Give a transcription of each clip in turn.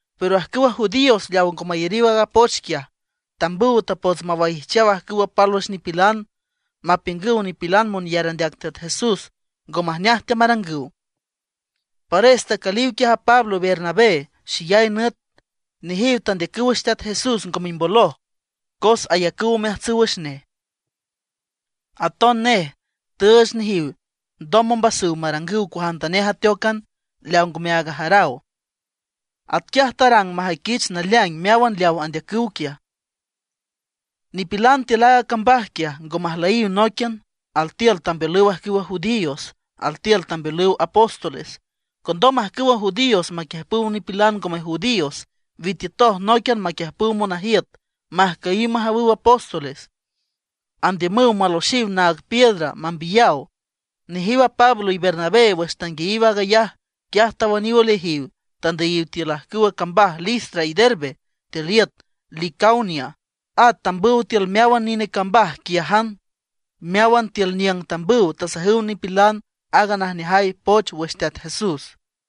Pero ajcüwa judíos leaw ngo mayariw aaga poch quiaj, tambüw tapots mawaijchaw ajcüw pálwüx nipilan, mapiüngüw nipilan monyar andeac Teat Jesús ngo majneaj teamarangüw. Pares tacüliw quiaj a Pablo y Bernabé xeyay nüt. Nejiw tandeacüw wüx Teat Jesús ngo mimboloj cos ayacüw omeajtsüw wüx nej. Aton nej tüüch nejiw ndoj ombasüw marangüw cuajantanej ateócan leawa ngome aag ajaraw. Atquiaj tarang majüiquich naleaing meáwan leaw andeacüw quiaj. Nipilan tiül aaga cambaj quiaj, ngo majlüyiw nóiquian; altiül tambeolüw ajcüwa judíos, altiül tambeolüw apóstoles. Condom ajcüwa judíos maquiüjpüw nipilan ngome judíos, witiütoj nóiquian maquiüjpüw monajiüt majcüyiw majawüw apóstoles, andiümüw maloxiw naag piedra, mambiyaw. Nejiw a Pablo y Bernabé, wüx tanguiayiw aag ayaj, quiaj tawüniw oleajiw, tandüyiw tiül ajcüwa cambaj Listra y Derbe tiül iüt Licaonia, at tambüw tiül meáwan nine cambaj quiájan. Meáwan tiül niüng tambüw tasajüw nipilan aaga najneajay poch wüx Teat Jesús.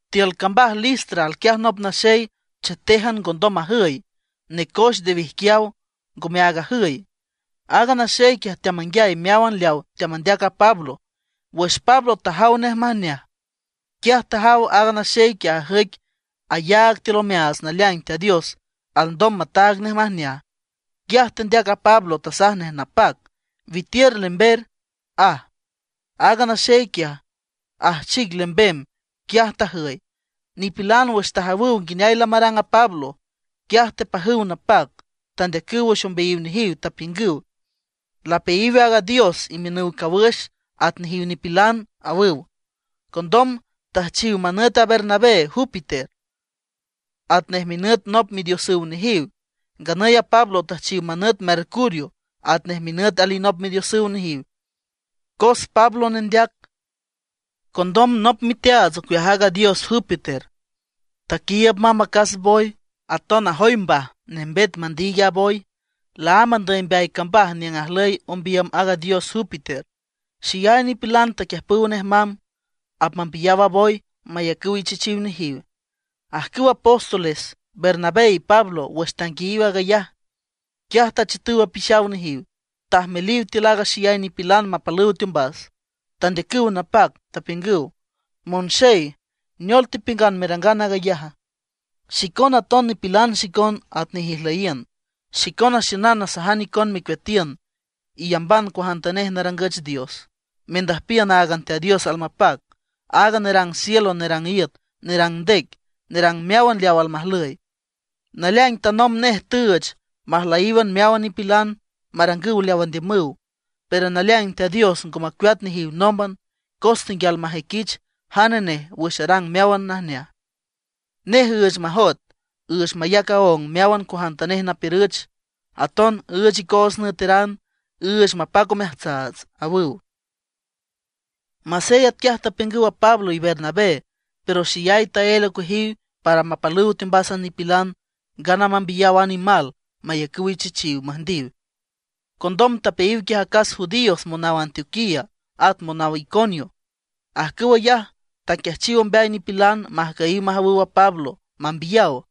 Tiül cambaj Listra, alquiaj nop naxey chetéjan ngondom majüy, necoex nde wijquiaw, ngome aag ajüy. Aaga naxey quiaj teamanguiay meáwan leaw teamandeac a Pablo. Wüx Pablo tajaw nej majneaj, quiaj tajaw aaga naxey quiaj ajüic ayaag tiül omeaats naleaing Teat Dios alndom mataag nej majneaj. Quiaj tendeac a Pablo, tasaj nej napac: ―Witiür lember ―aj. Aaga naxey quiaj, ajchic lembem, quiaj tajüy. Nipilan wüx tajawüw nguineay lamarang a Pablo, quiaj tepajüw napac, tandeacüw wüx ombeayiw nejiw, tapiüngüw: ―¡Lapeayiw a dios imiünüw cawüx, at nejiw nipilan! ―awüw. Condom tüjchiw manüt a Bernabé, Júpiter, atnej minüt nop midiosüw nejiw, nganüy a Pablo tüjchiw manüt Mercurio, atnej minüt alinop midiosüw nejiw, cos Pablo nendeac. Condom nop miteaats ocueaj aaga dios Júpiter, taquiiüb mamb acas boy, aton ajoy mbaj nembet mandiig a boy, laámb andüy mbeay cambaj niüng ajlüy ombiüm aaga dios Júpiter. Xeyay nipilan taquiüjpüw nej mamb; apmambiyaw a boy mayacüw ichechiw nejiw. Ajcüw apóstoles Bernabé y Pablo wüx tanguiayiw aag ayaj, quiaj tachiütüw apixaw nejiw, tajmeliw tiül a xeyay nipilan mapalüw teombas, tendeacüw napac, tapiüngüw: ―¡Monxey! ¿Neol tepiüngan merangan aag ayaja? Xicona aton nipilan xicon atnej ijlüyiün. Xicona xiünan nasajan icon mecueatiün iyamban cuajantanej narangüch dios, mendüjpiün áagan Teat Dios almapac, aag nerang cielo, nerang iüt, nerang ndec, nerang meáwan leaw almajlüy. Naleaing tanomb nej tüüch majlüyíwan meáwan nipilan, marangüw leaw andiümüw. Pero naleaing Teat Dios ngo macueat nejiw nómban, cos tenguial majüiquich jane nej wüx arang meáwan najneaj; nej üüch majoet, üüch mayac aóng meáwan cuajantanej napiürüch. Aton üüch icoots nüeteran, üüch mapac omeajtsaats ―awüw. Masey atquiaj tapiüngüw a Pablo y Bernabé, pero xeyay taél ocueajiw para mapalüw teombas a nipilan, ngana mambiyaw a nimal mayacüw ichechiw, müjndiw. Condom tapeayiw quiaj acas judíos monaw Antioquía at monaw Iconio. Ajcüw ayaj taquiajchiw ombeay nipilan majcüyiw majawüw a Pablo, mambiyaw.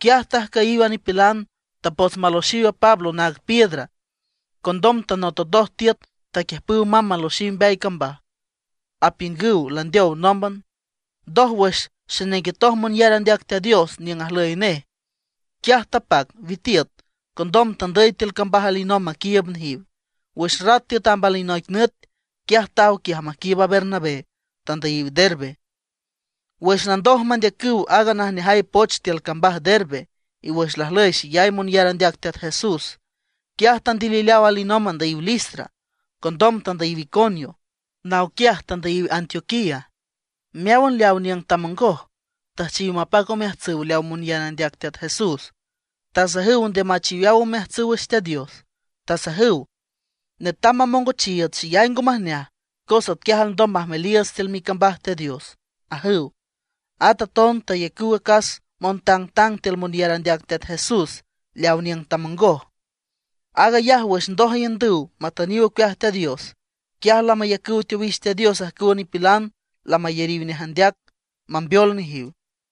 Quiaj tajcüyiw a nipilan, tapots maloxiw a Pablo naag piedra. Condom tanototoj tiüt, taquiüjpüw mamb maloxiw mbeay cambaj, apiüngüw landeow nómban. Ndoj, wüx xenenguetoj monyar andeac Teat Dios niüng ajlüy nej, quiaj tapac witiüt. Condom tandüy tiül cambaj alinomb maquiiüb nejiw. Wüx rat tiüt amb alinoic nüt, quiaj taw quiaj maquiiüb Bernabé, tandüyiw Derbe. Wüx landoj mandeacüw aaga najneajay poch tiül cambaj Derbe, y wüx lajlüy xeyay monyar andeac Teat Jesús, quiaj tandilileaw alinomb andüyiw Listra. Condom tandüyiw Iconio, naw quiaj tandüyiw Antioquía. Meáwan leaw niüng tamongoj, tüjchiw mapac omeajtsüw leaw monyar andeac Teat Jesús, tasajüw nde machiweaw omeajtsüw wüx Teat Dios, tasajüw: ―Netam mamongochiiüts xeyay ngo majneaj, cos atquiaj alndom majmeliiüts tiül micambaj Teat Dios ―ajüw. At aton tayacüw acas montangtang tiül monyar andeac Teat Jesús leaw niüng tamongoj. Aag ayaj wüx ndoj aiündüw matüniw ocueaj Teat Dios, quiaj lamayacüw teowix Teat Dios ajcüwa nipilan lamayariw nej andeac, mambeol nejiw.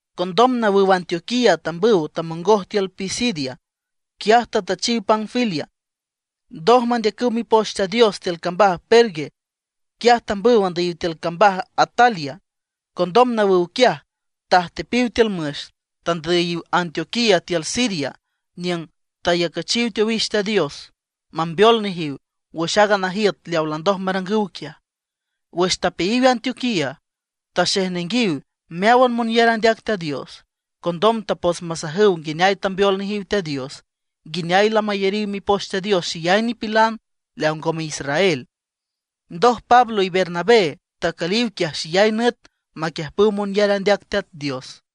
Condom nawüw Antioquía tambüw tamongoj tiül Pisidia, quiaj tatüchiw Panfilia. Ndoj mandeacüw Mipoch Teat Dios tiül cambaj Perge, quiaj tambüw andüyiw tiül cambaj Atalia. Condom nawüw quiaj, tajtepiw tiül müx, tandüyiw Antioquía tiül Siria niüng tayacüchiw teowix Teat Dios, mambeol nejiw wüx aaga najiüt leaw landoj marangüw quiaj. Wüx tapeayiw Antioquía, taxejnenguiw meáwan monyar andeac Teat Dios. Condom tapots masajüw nguineay tambeol nejiw Teat Dios, nguineay lamayariw Mipoch Teat Dios xeyay nipilan leaw ngome israel. Ndoj Pablo y Bernabé tacüliw quiaj xeyay nüt maquiüjpüw monyar andeac Teat Dios.